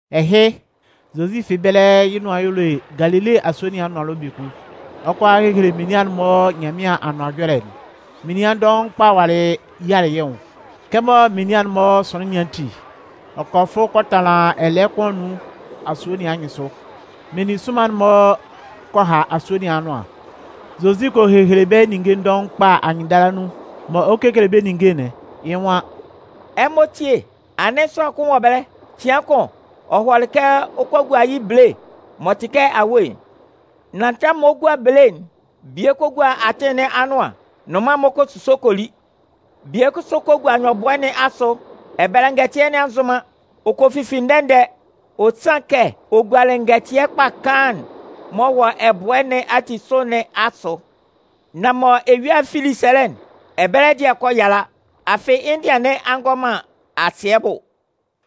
Ɛhɩ, Zozi fi ɛbɛlɛ yɩ́ nʋan y'ɔ le Galile asue nɩn anʋan ɛlɔ biekun. Ɔ 'kɔ a hehele menian'n-mɔ Nyanmɩan Anʋan Ɛjɔlɛ'n. Menian dɔʋn kpa walɩ yialɩ yɩ́ nwʋn. Kɛmɔ menian'n-mɔ sʋnlɩn nɩn ati, ɔ kɔ fʋ kɔ tanlan ɛlɛɛ kʋn anun asue nɩn anyɩnsʋ. Meninsʋnman'n kɔ ha asue nɩn anʋan. Zozi kɔ hehele bɛ́ ninnge dɔʋn kpa anyɩnndala nun. Mɔ ɔ 'kekele bɛ́ ninnge'n, yɩ́ nwan: “Ɛmɔ tíe! Anɩn sʋanlan kʋn wɔ ɛbɛlɛ. Cɩan kʋn, ɔ hɔlɩ kɛ ɔ 'kɔ a gua yɩ́ bele (m'ɔ tɩ kɛ awe'n). Nan tɛmʋn mɔ ɔ 'gua bele'n, bie kɔ gua atɩn nɩn anʋan. Nnʋnman'n-mɔ kɔ a kɔ suso kɔ li. Bie kʋsʋ kɔ gua nyɔbʋɛ nɩn asʋ. Ɛbɛlɛ ngɛtɩɛ nɩn a nzʋn man. Ɔ kɔ fifi ndɛ-ndɛ, ɔ sanlɩn kɛ ɔ gualɩ ngɛtɩɛ kpa kaan'n m'ɔ wɔ ɛbʋɛ nɩn ati sʋ nɩn asʋ. Nan mɔ eyua'n fili sɛlɛ'n, ɛbɛlɛ dɩɛ'n kɔ yala. Afɩ, yɩ́ ndɩan nɩn a ngɔ man asɩɛ bʋ.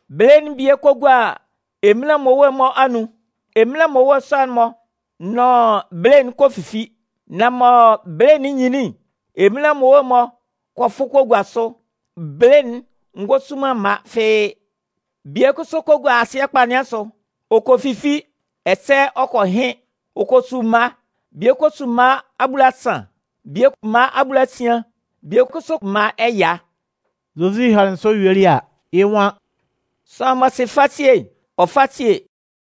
Bele'n bie kɔ gua eminlan mmowe'n-mɔ anun. Eminlan mmowe sɔ'n-mɔ nʋn bele'n kɔ fifi. Nan mɔ bele'n nyinlin'n, eminlan mmowe'n-mɔ kɔ fʋ kɔ gua sʋ. Bele'n ngɔ su man mma fɩ́ɩ́. Bie kʋsʋ kɔ gua asɩɛ kpa nɩn asʋ. Ɔ kɔ fifi, ɛsɛ ɔ kɔ hɩn, ɔ kɔ su mma. Bie kɔ su mma abulasan, bie mma abulasian, bie kʋsʋ mma ɛya.” Zozi hanlɩn sɔ yuelɩ a, yɩ́ nwan: “Sʋanlan m'ɔ sɩ fasie'n, ɔ fá síe!”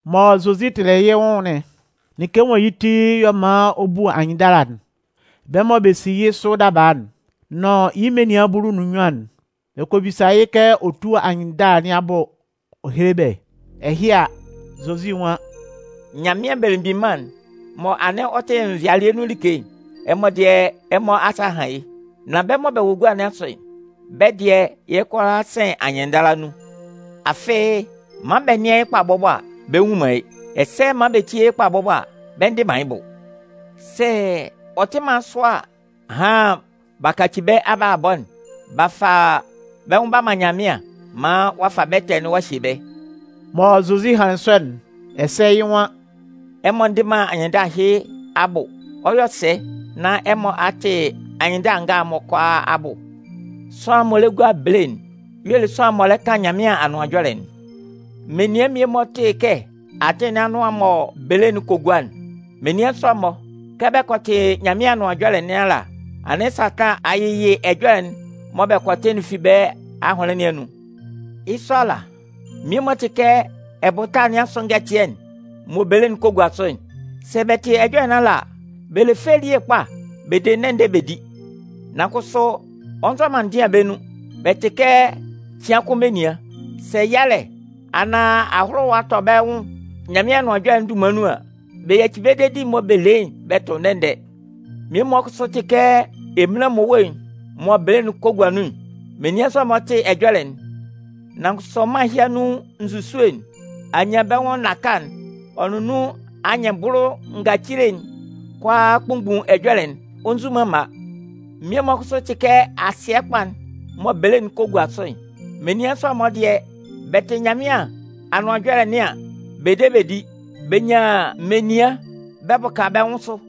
Mɔ Zozi tɩlɩ yɩ́ nwʋn'n, like mɔ yɩ́ ti y'ɔ man ɔ bu anyɩnndala'n, bɛ́ mɔ bɛ si yɩ́ sʋ daba'n nʋn yɩ́ menian bulu nʋn nnyuan'n, bɛ kɔ bisa yɩ́ kɛ ɔ tú anyɩnndala nɩn abʋ ɔ héle bɛ́. Ɛhɩ a, Zozi nwan: “Nyanmɩan Belemgbin Mân'n mɔ anɩn ɔ tɩ nvɩalɩɛ nun like'n, ɛmɔ dɩɛ ɛmɔ asa a han yɩ́. Nan bɛ́ mɔ bɛ wɔ gua nɩn asʋ'n, bɛ́ dɩɛ, yɩ́ kʋalaa sɩn anyɩnndala nun, afɩ man Bɛ nɩ́an yɩ́ kpa bɔbɔ a, bɛ nnwun man yɩ́. Ɛsɛ man bɛ tíe yɩ́ kpa bɔbɔ a, bɛ ndɩ man yɩ́ bʋ. Sɛ ɔ tɩ man sɔ a, ahan b'a kaci bɛ́ abalabɔ'n b'a fa bɛ́ nwʋn b'a man Nyanmɩan maan ɔ a fa bɛ́ ɛtɛ nɩn a hye bɛ́.” Mɔ Zozi hanlɩn sɔ'n, ɛsɛ yɩ́ nwan: “Ɛmɔ ndɩ man anyɩnndala ɛhɩ abʋ, ɔ 'yɔ sɛ nán ɛmɔ a tɩ anyɩnndala nga'n-mɔ kʋalaa abʋ? Sʋanlan m'ɔ lɛ gua bele'n y'ɔ le sʋanlan'n m'ɔ kan Nyanmɩan Anʋan Ɛjɔlɛ'n. Menian mmie-mɔ tɩ kɛ atɩn nɩn anʋan'n mɔ bele'n kɔ gua'n. Menian sɔ'n-mɔ, kɛ bɛ kɔ tɩ Nyanmɩan Anʋan Ɛjɔlɛ nɩn ala, anɩn Satan a yɩ ɛjɔlɛ'n mɔ bɛ kɔ tɩ'n fi bɛ́ ahʋnlɩn nɩn anun. Yɩ́ sɔ ala, mmie-mɔ tɩ kɛ ɛbʋta nɩn asʋ ngɛtɩɛ'n mɔ bele'n kɔ gua sʋ'n. Sɛ bɛ tɩ ɛjɔlɛ nɩn ala a, bɛ le fɛ elie kpa bɛ de ndɛ-ndɛ bɛ di. Nan kʋsʋ, ɔ nzɔ man ndɩan bɛ́ nun. Bɛ tɩ kɛ cɩan kʋn menian. Sɛ yalɛ anaan ahʋlʋwa tʋ bɛ́ wɔ Nyanmɩan Anʋan Ɛjɔlɛ'n dunman nun an, bɛ yaci bɛ dedi'n mɔ bɛ le yɩ́'n bɛ tʋ ndɛ-ndɛ. Mmie-mɔ kʋsʋ tɩ kɛ eminlan mmowe'n mɔ bele'n kɔ gua nun'n. Menian sɔ'n-mɔ tɩ ɛjɔlɛ'n, nan kʋsʋ mân ɛhɩ anun nzusue'n, anyanbɛnwʋn naka'n, ɔ nʋn anyɩnbʋlʋ ngacile'n kʋalaa kpunmgbun ɛjɔlɛ'n. Ɔ nzu man mma. Mmie-mɔ kʋsʋ tɩ kɛ asɩɛ kpa'n mɔ bele'n kɔ gua sʋ'n. Menian sɔ'n-mɔ dɩɛ, bɛ tɩ Nyanmɩan Anʋan Ɛjɔlɛ nɩn an, bɛ de bɛ di. Bɛ nyan menian bɛ bʋka bɛ́ nwʋn sʋ.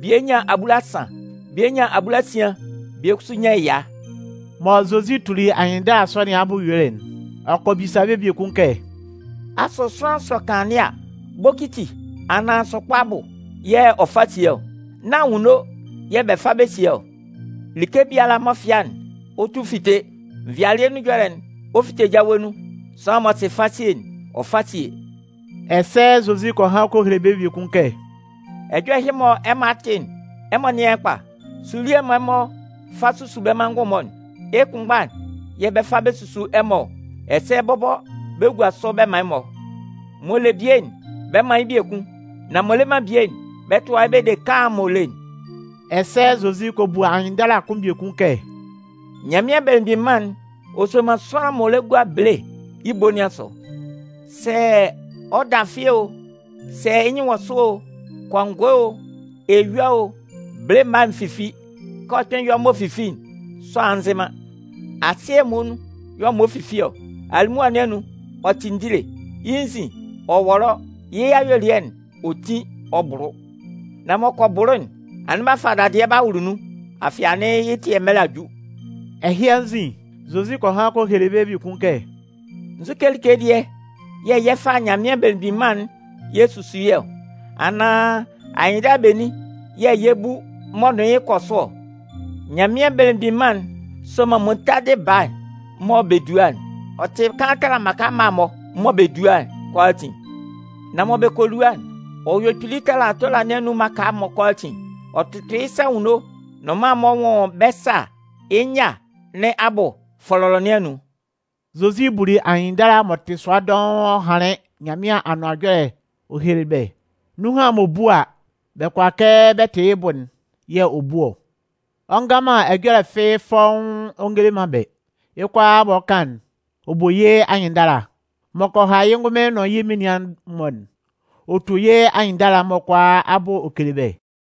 Bie nyan abulasan, bie nyan abulasian, bie kʋsʋ nyan ɛya.” Mɔ Zozi tuli anyɩnndala sɔ nɩn abʋ yuelɩ'n, ɔ kɔ bisa bɛ́ biekun kɛ: “Asʋ sʋanlan sɔ kanlannɩɛ a, bokiti anaan sʋkpa abʋ yɛ̂ ɔ fa sie ɔ? Nán anwunno yɛ̂ bɛ fa bɛ sie ɔ? Like biala m'ɔ fɩa'n, ɔ 'tu fite. Nvɩalɩɛ nun ɛjɔlɛ'n, ɔ 'fite jawe nun. Sʋanlan m'ɔ sɩ fasie'n, ɔ fá sie!” Ɛsɛ Zozi kɔ han kɔ hele bɛ́ biekun kɛ: “Ɛjɔlɛ ɛhɩ mɔ ɛmɔ a tɩ'n, ɛmɔ nɩ́an yɩ́ kpa. Sulɩɛ'n mɔ ɛmɔ fa su bɛ́ manngʋn'n-mɔ'n, yɩ́ kʋnmgba'n yɛ̂ bɛ 'fa bɛ su ɛmɔ ɔ, ɛsɛ bɔbɔ bɛ 'gua sʋ bɛ man ɛmɔ. M'ɔ le bie'n, bɛ 'man yɩ́ biekun. Nan m'ɔ le man bie'n, bɛ 'tʋa yɩ́ bɛ de kaan'n m'ɔ le'n.” Ɛsɛ Zozi kɔ bu anyɩnndala kʋn biekun kɛ: “Nyanmɩan Belemgbin Mân'n, ɔ soman sʋanlan m'ɔ lɛ gua bele yɩ́ ebo nɩn asʋ. Sɛ ɔ dafɩ o, sɛ yɩ́ nyɩn wɔ sʋ o, Kɔngɔɛ o, eyua o, bele mma'n fifi. Kɛ ɔ kpɩn yɔ m'ɔ fifi'n, sʋanlan nzɩ man. Asɩɛ'n muonun y'ɔ man ɔ fifi ɔ. Alimʋa nɩn anun, ɔ tɩ ndile. Yɩ́ nzin, ɔ wɔlɔ, yɩ́ ayuelɩɛ'n, ɔ tin, ɔ bʋlʋ. Nan m'ɔ kɔ bʋlʋ'n, anɩn b'a fa dadɩɛ b'a wʋlʋ nun, afɩ anɩn yɩ́ ɛtɩɛ mɛlɛ nɩn a ju.” Ɛhɩ anzin, Zozi kɔ han kɔ hele bɛ́ biekun kɛ: “Nzukɛ like dɩɛ yɛ̂ yɛ 'fa Nyanmɩan Belemgbin Mân'n yɛ susu yɩ́ ɔ? Anaan anyɩnndala benin yɛ̂ yɛ 'bu m'ɔ nʋn yɩ́ kɔ sʋ ɔ? Nyanmɩan Belemgbin Mân'n soman muntadɩ baa'n mɔ bɛ dua'n. Ɔ tɩ kaan tala mmaka mma'n-mɔ mɔ bɛ dua'n kʋalaatin. Nan mɔ bɛ kɔ lua'n, ɔ yɔ kpili tala tola nɩn anun mmaka'n-mɔ kʋalaatin. Ɔ tʋtʋ yɩ́ sa anwunno, nnʋnman'n-mɔ nwʋn bɛ́ sâ yɩ́ nyâ nɩn abʋ fɔlɔlɔ nɩn anun.” Zozi buli anyɩnndala m'ɔ tɩ sʋa dɔʋn ɔ hanlɩn Nyanmɩan Anʋan Ɛjɔlɛ'n ɔ helelɩ bɛ́. Nunhan m'ɔ bu a, bɛ kʋala kɛ bɛ tɩ yɩ́ bʋ'n yɛ̂ ɔ bu ɔ. Ɔ ngan man ɛjɔlɛ fɩ́ɩ́ fɔ́ʋ́n ɔ ngele man bɛ́. Yɩ́ kʋalaa m'ɔ kan'n, ɔ bu yɩ́ nwʋn anyɩnndala. M'ɔ kɔ ha yɩ́ ngʋnmɩn nʋn yɩ́ menian'n-mɔ'n, ɔ tu yɩ́ anyɩnndala'n-mɔ kʋalaa abʋ ɔ kele bɛ́.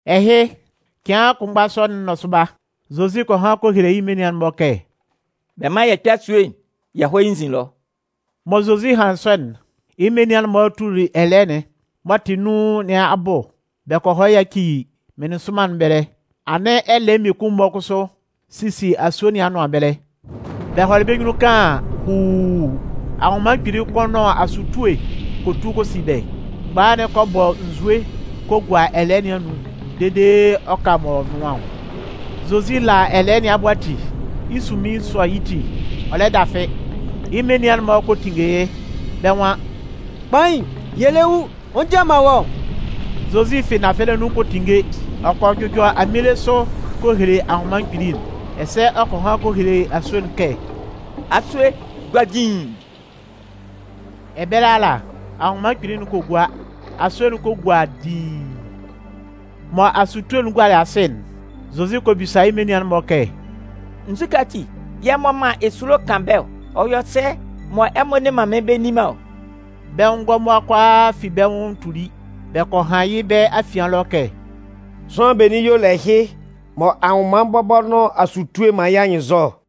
Ɛhɩ, cɩan kʋnmgba sɔ'n nɔsʋba, Zozi kɔ han kɔ hele yɩ́ menian'n-mɔ kɛ: “Bɛ mán yɛ kpɛ́ asue'n yɛ hɔ́ yɩ́ nzin ɛlɔ.” Mɔ Zozi hanlɩn sɔ'n, yɩ́ menian'n-mɔ tuli ɛlɛɛ'n m'ɔ tɩ nun nɩn abʋ bɛ kɔ yaci meninsʋnman nɩn ɛbɛlɛ. Anɩn ɛlɛɛ mmie-mɔ kʋsʋ sisi asue nɩn anʋan ɛbɛlɛ. Bɛ hɔlɩ bɛ́ nyunnun kaan an, huuu, anwʋnman kpili kʋn nʋn asutue kɔ tu kɔ si bɛ́. Mgbaha'n kɔ bɔ nsue kɔ gua ɛlɛɛ nɩn anun dede ɔ ka m'ɔ nʋan ɔ. Zozi la ɛlɛɛ nɩn abʋ ati, yɩ́ sunmin sɔ yɩ́ ti, ɔ lɛ dafɩ. Yɩ́ menian'n-mɔ kɔ tinnge yɩ́. Bɛ́ nwan: “Kpain, yɛ lɛ wu! Ɔ njian man wɔ́ ɔ?” Zozi fi nafɛlɛ nun kɔ tinnge. Ɔ kɔ jʋjɔ aminle sʋ kɔ hele anwʋnman kpili'n. Ɛsɛ ɔ kɔ han kɔ hele asue'n kɛ: “Asue, gua diin!” Ɛbɛlɛ ala, anwʋnman kpili'n kɔ gua. Asue'n kɔ gua diin. Mɔ asutue'n gualɩ asɩ'n, Zozi kɔ bisa yɩ́ menian'n-mɔ kɛ: “Nzukɛ ati yɛ̂ ɛmɔ man esulo kan bɛ́ ɔ? Ɔ yɔ sɛ mɔ ɛmɔ nne man mɩ́n bɛ nni man ɔ?” Bɛ́ nwʋn ngɔmʋa kʋalaa fi bɛ́ nwʋn tuli, bɛ kɔ han yɩ́ bɛ́ afian ɛlɔ kɛ: “Sʋanlan benin y'ɔ le ɛhɩ mɔ anwʋnman bɔbɔ nʋn asutue man yɩ́ anyɩnnzɔ ɔ?”